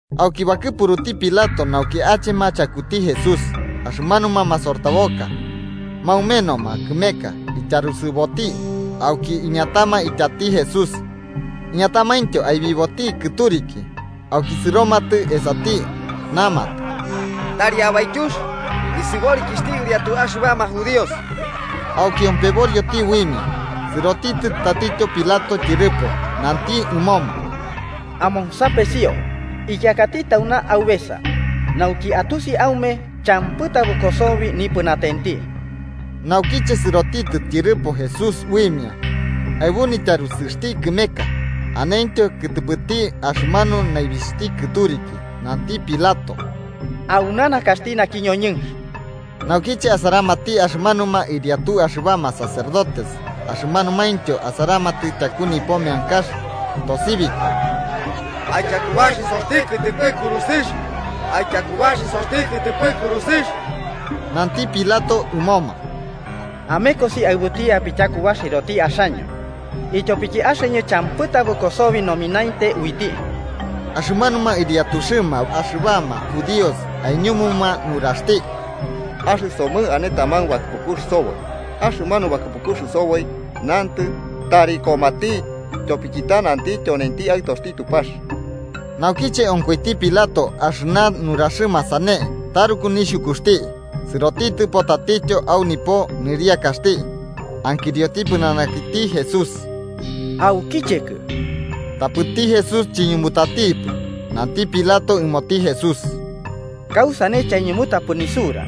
Auki bakɨpuruti Pilato nauki achema chakuti Jesús. Axɨmanuma masortaboka maumenoma kɨmeka ityarusɨboti auki iñatama ityati Jesús, iñatamaintyo aibiboti kɨturiki. Auki sɨromatɨ esati, namatɨ: –¡Tari ayaityux nisɨborikixhti ɨriatuxɨma axɨbama judíos! Auki ompeborioti uimia. Sɨrotitɨ tatityo Pilato tyɨrɨpo, nanti ɨmoma: –¡Amonsapesio! Ikiakati tauna aubesa, nauki atusi aume champɨ tabɨko sobi nipɨnatenti. Naukiche sɨrotitɨ tyɨrɨpo Jesús uimia, aɨbu nityarusɨxti kɨmeka, anentyo kɨtɨpɨti axɨmanu naibixhti kɨturiki. Nanti Pilato: –¡Auna nakaxti naki ñoñɨnx! Naukiche asaramati axɨmanuma ɨriatu axɨbama sacerdotes axɨmanumaintyo asaramatɨ tyaku nipo meankax, tosibikoma: –¡Aityakubaxisoti kɨtɨpɨ kurusɨx! ¡Aityakubaxisoti kɨtɨpɨ kurusɨx! Nanti Pilato ɨmoma: –Amekosi aɨbuti apityakubaxisoti axaño, ityopiki axɨñɨ champɨ tabɨko sobi nomineinte iuti. Axɨmanuma ɨriatuxɨma amanuma judíos aiñumuma nuraxti: –Axɨsomɨ ane taman bakɨpukux soboi, axɨmanu bakɨpukux soboi nantɨ, tari komati, tyopiki ta nanti tyonenti Aɨtoxti Tupax. Naukiche onkoiti Pilato axɨna nuraxɨma sane, taruku nixhukuxti. Sɨrotitɨpo tatityo au nipo niriakaxti ankirioti pɨnanakiti Jesús: –¿Aukichekɨ? Tapɨti Jesús chiñumutatipɨ. Nanti Pilato ɨmoti Jesús: –¿Kausane chaiñumutapɨ nisura?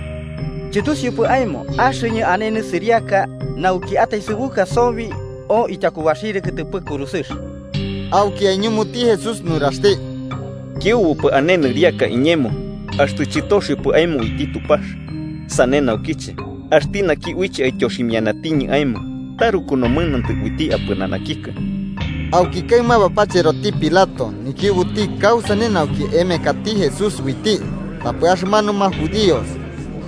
¿Chɨtusiupɨ aemo axɨñɨ ane nisɨriaka nauki ataesɨbuka sobi o ityakubaxirɨ kɨtɨpɨ kurusɨx? Auki aiñumuti Jesús nuraxti: –Kiubupɨ ane nɨriaka iñemo, axtɨ chɨtoxiopɨ aemo uiti Tupax. Sane naukiche axti naki uiche aityoximianatiñɨ aemo taruku nomɨnantɨ uiti apɨnanakikɨ. Auki kaɨma, bapacheroti Pilato nikiubuti kausane nauki emekati Jesús uiti, tapɨ axɨmanuma judíos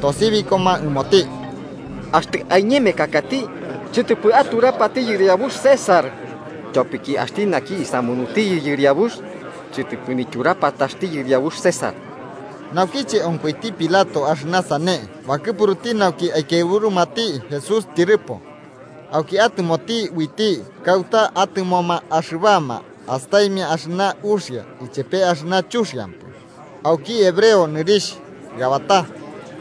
tosibikoma ɨmoti: –¡Axtɨ aiñemekakati, chɨtɨpɨ aturapati yɨriabux César! ¡Tyopiki axti naki isamunutiyɨ yɨriabuxti, chɨtɨpɨ nityurapataxti yɨriabux César! Naukiche onkoiti Pilato axɨna sane, bakɨpuruti nauki aikiaɨburumati Jesús tyɨrɨpo. Auki atɨmoti uiti kauta atɨmoma axɨbama astaimia axɨna uxia ichepe axɨna chuxiampɨ, auki hebreo nɨrixh Gabatá,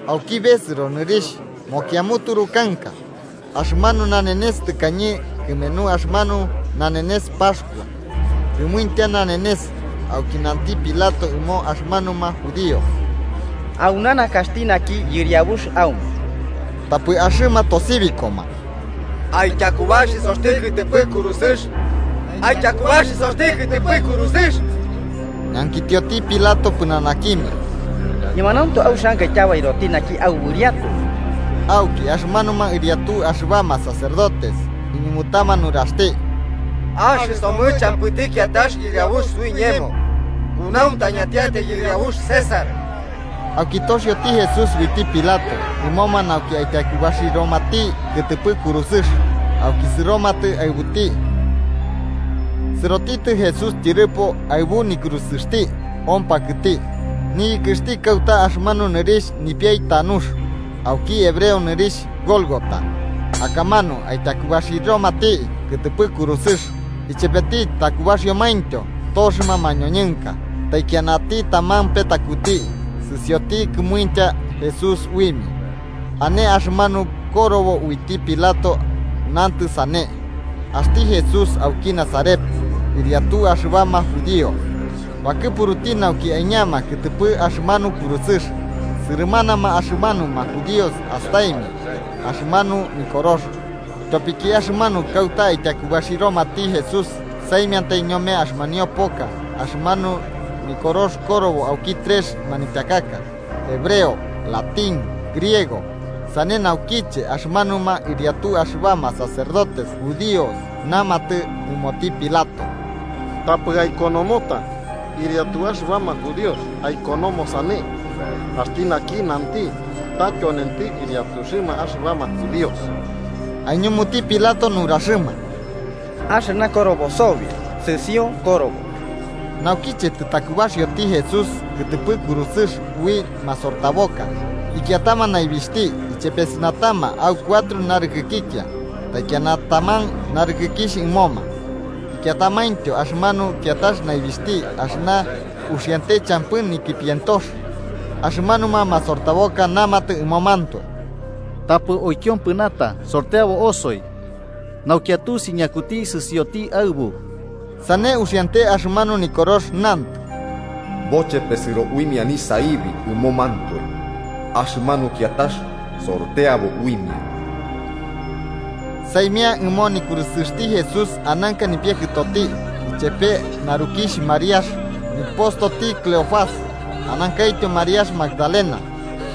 auki besɨro nɨrixh mokiamuturu kanka. Axɨmanu nanenes tɨkañe kɨmenu axɨmanu nanenes Paxkua, kɨmuintya nanenes. Auki nanti Pilato ɨmo axɨmanuma judíos: –¡Auna nakaxti naki yɨriabux aume! Tapɨ axɨma tosibikoma: –¡Aityakubaxisoti kɨtɨpɨ kurusɨx! ¡Aityakubaxisoti kɨtɨpɨ kurusɨx! Ñankitioti Pilato pɨnanakimia: –¿Ñemanauntu auxianka ityabairoti naki yɨriabux aume? Auki axɨmanuma ɨriatu axɨbama sacerdotes iñumutama nuraxti: –¡Axɨsomɨ champɨti kiatax yɨriabux suiñemo, kunauntañatiatai yɨriabux César! Auki toxioti Jesús uiti Pilato ɨmoma nauki aityakubaxiromati kɨtɨpɨ kurusɨx, auki sɨromatɨ aɨbuti. Sɨrotitɨ Jesús tyɨrɨpo aɨbu nikurusɨxti ompakɨti, niyɨkɨxti kauta axɨmanu nɨrixh “Nipiai Tanux” (auki hebreo nɨrixh Golgota). Akamanu aityakubaxiromati kɨtɨpɨ kurusɨx, ichepeti takubaxiomaintyo toxɨma mañoñɨnka, taikianati taman petakuti, sɨsioti kɨmuintya Jesús uimia. Ane axɨmanu korobo uiti Pilato nantɨ sane: “Axti Jesús auki Nazaret, ɨriatu axɨbama judíos”, bakɨpuruti nauki aiñama kɨtɨpɨ axɨmanu kurusɨx. Sɨrɨmanama axɨmanuma judíos astaimia axɨmanu nikorox, tyopiki axɨmanu kauta aityakubaxiromati Jesús saimiantai ñome axɨmanio poka, axɨmanu nikorox korobo auki trex manityakaka, hebreo, latín, griego. Sane naukiche, axɨmanuma ɨriatu axɨbama sacerdotes judíos namatɨ ɨmoti Pilato: –Tapɨ aikonomota: ‘Ɨriatu axɨbama judíos’, aikonomo sane: ‘Axti naki nanti ta tyonenti ɨriatuxɨma axɨbama judíos.’ Aiñumuti Pilato nuraxɨma: –Axɨna korobo sobi, sɨsio korobo. Naukiche tɨtakubaxioti Jesús kɨtɨpɨ kurusɨx ui masortaboka, ikiatama naibixhti ichepesɨnatama au cuatro narɨkɨkikia, taikiana taman narɨkɨkixh ɨmoma. Ikiatamaintyo axɨmanu kiatax naibixhti, axɨna uxiante champɨ nikipientox, axɨmanuma masortaboka namatɨ ɨmomantoe: –Tapɨ uikiompɨnata, sorteabo osoi, nauki atusi ñakuti sɨsioti aɨbu. Sane uxiante axɨmanu Nikorox nantɨ: “Bochepesɨro uimia nisaibi ɨmomantoe, axɨmanu kiatax sorteabo uimia.” Saimia ɨmo nikurusɨxti Jesús ananka nipiakɨtoti, ichepe narukixh Mariax, nikɨpostoti Cleofás, anankaityo Mariax Magdalena.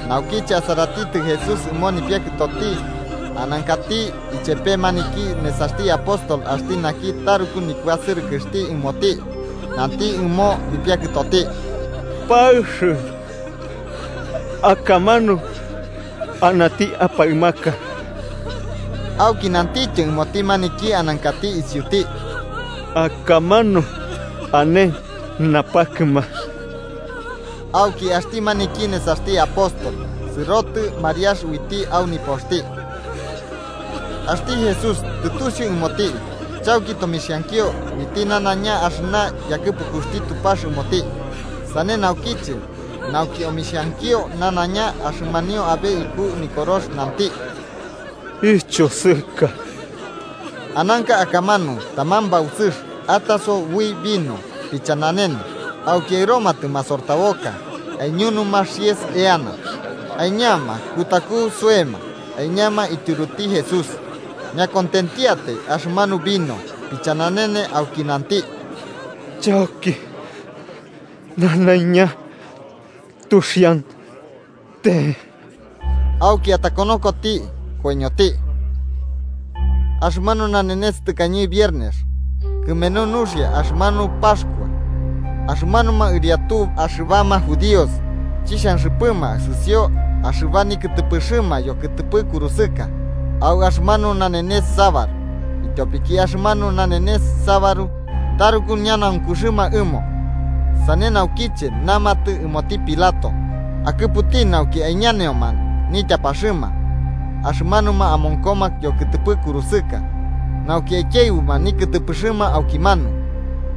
Naukiche asaratitɨ Jesús ɨmo nipiakɨtoti, anankati ichepe maniki nesaxti apóstol axti naki taruku nikuasɨrɨkɨxti ɨmoti, nanti ɨmo nipiakɨtoti: –Nipiakɨ, akamanu anati aɨ. Auki nantityo ɨmoti maniki anankati isiuti: –Akamanu ane napakɨma. Auki axti maniki nesaxti apóstol sɨrotɨ Mariax uiti au nipoxti. Axti Jesús tɨtusiu ɨmoti chauki tomixhankio uiti nanaiña axɨna yakɨpukuxti Tupax ɨmoti. Sane naukiche, nauki omixhankio nanaiña axɨmanio abe iku Nikorox, nanti: –Ichosɨka. Ananka akamanu taman bausɨx ataso ui vino pichananene. Auki aɨromatɨ masortaboka aiñunuma xies eana, aiñama kutaku soema aiñama ityuruti Jesús. Ñakontentiatai axɨmanu vino pichananene auki nanti: –Chauki naiña tuxiante sobi. Auki atakonokoti, koiñoti. Axɨmanu nanenes tɨkañe viernes kɨmenu nuxia axɨmanu Paxkua, axɨmanuma ɨriatu axɨmanuma judíos chixhanxɨpɨma sɨsio axɨba nikɨtɨpɨxɨma yokɨtɨpɨ kurusɨka au axɨmanu nanenes sabaru, ityopiki axɨmanu nanenes sabaru taruku ñanaunkuxɨma ɨmo. Sane naukiche namatɨ ɨmoti Pilato akɨputi nauki aiñaneoma nityapaxɨma axɨmanuma amonkoma yokɨtɨpɨ kurusɨka nauki aikiaɨbuma nikɨtɨpɨxɨma aukimanu.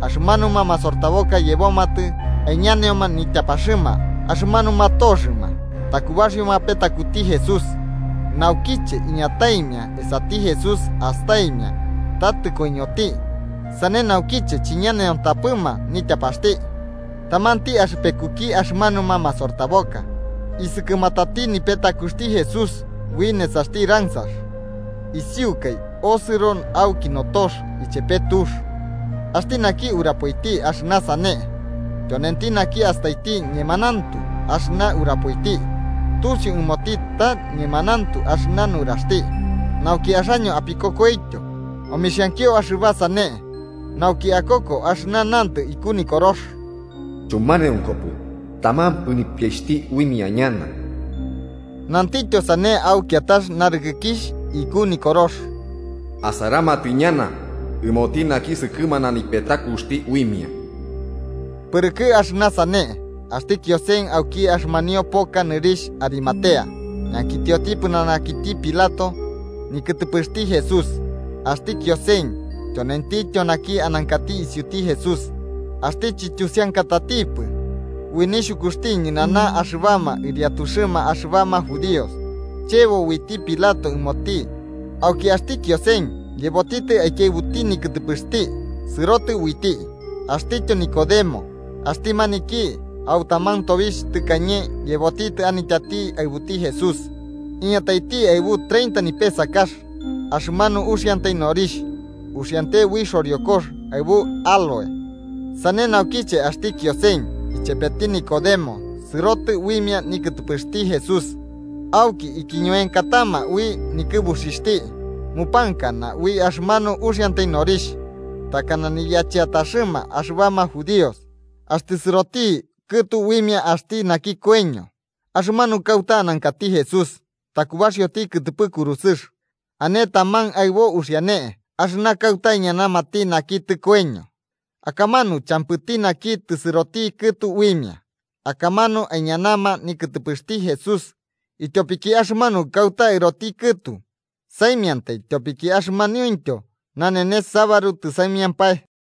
Axɨmanuma masortaboka yebomatɨ aiñaneoma nityapaxɨma axɨmanuma toxɨma takubaxɨoma petakuti Jesús. Naukiche iñataimia esati Jesús, astaimia ta tɨkoiñoti. Sane naukiche chiñaneontapɨma nityapaxti. Tamanti axɨpekuki axɨmanuma masortaboka isɨkɨmatati nipetakuxti Jesús ui nesaxti ransax, isiukai osɨro auki notox ichepe tux. Axti naki urapoiti axɨna sane tyonenti naki astaiti, ñemanauntu axɨna urapoiti. Tusiu ɨmoti ta ñemanauntu axɨna nuraxti, nauki axaño apikokoityo. Omixhankio axɨba sane nauki akoko axɨna nantɨ iku Nikorox: “Chumaneonkopɨ taman nipiaixhti uimia ñana.” Nantityo sane au kiatax narɨkɨkixh iku Nikorox: “Asaramati ñana ɨmoti naki sɨkɨmana nipetakuxti uimia”. Pɨrɨkɨ axɨna sane, axti Kiosen auki axɨmanio poka nɨrixh Arimatea, ñankitioti pɨnanakiti Pilato nikɨtɨpɨxti Jesús. Axti Kiosen tyonentityo naki anankati isiuti Jesús, axti chityusiankatatipɨ ui nixhukuxti ñɨnana axɨbama ɨriatuxɨma axɨbama judíos. Chebo uiti Pilato ɨmoti, auki axti Kiosen yebotitɨ aikiaɨbuti nikɨtɨpɨxti sɨrotɨ uiti. Axtityo Nicodemo, axti maniki au taman tobixh tɨkañe yebotitɨ anityati aɨbuti Jesús, iñataiti aɨbu treinta nipesakax axɨmanu uxiantai norixh, uxiante ui xoriokox aɨbu áloe. Sane naukiche axti Kiosen ichepeti Nicodemo sɨrotɨ uimia nikɨtɨpɨxti Jesús auki ikiñuenkatama ui nikɨbuxixhti mupankana ui axɨmanu uxiantai norixh, takana niyacheataxɨma axɨbama judíos axtɨ sɨroti kɨtu uimia axti naki koiño. Axɨmanu kauta anankati Jesús takubaxioti kɨtɨpɨ kurusɨx, ane taman aɨbo uxiane axɨna kauta aiñanamati naki tɨkoiño akamanu champɨti naki tɨsɨroti kɨtu uimia. Akamanu aiñama nikɨtɨpɨxti Jesús, ityopiki axɨmanu kauta aɨroti kɨtu saimiantai tyopiki axɨmanuintyo nanenes sabaru tɨsaimiampae.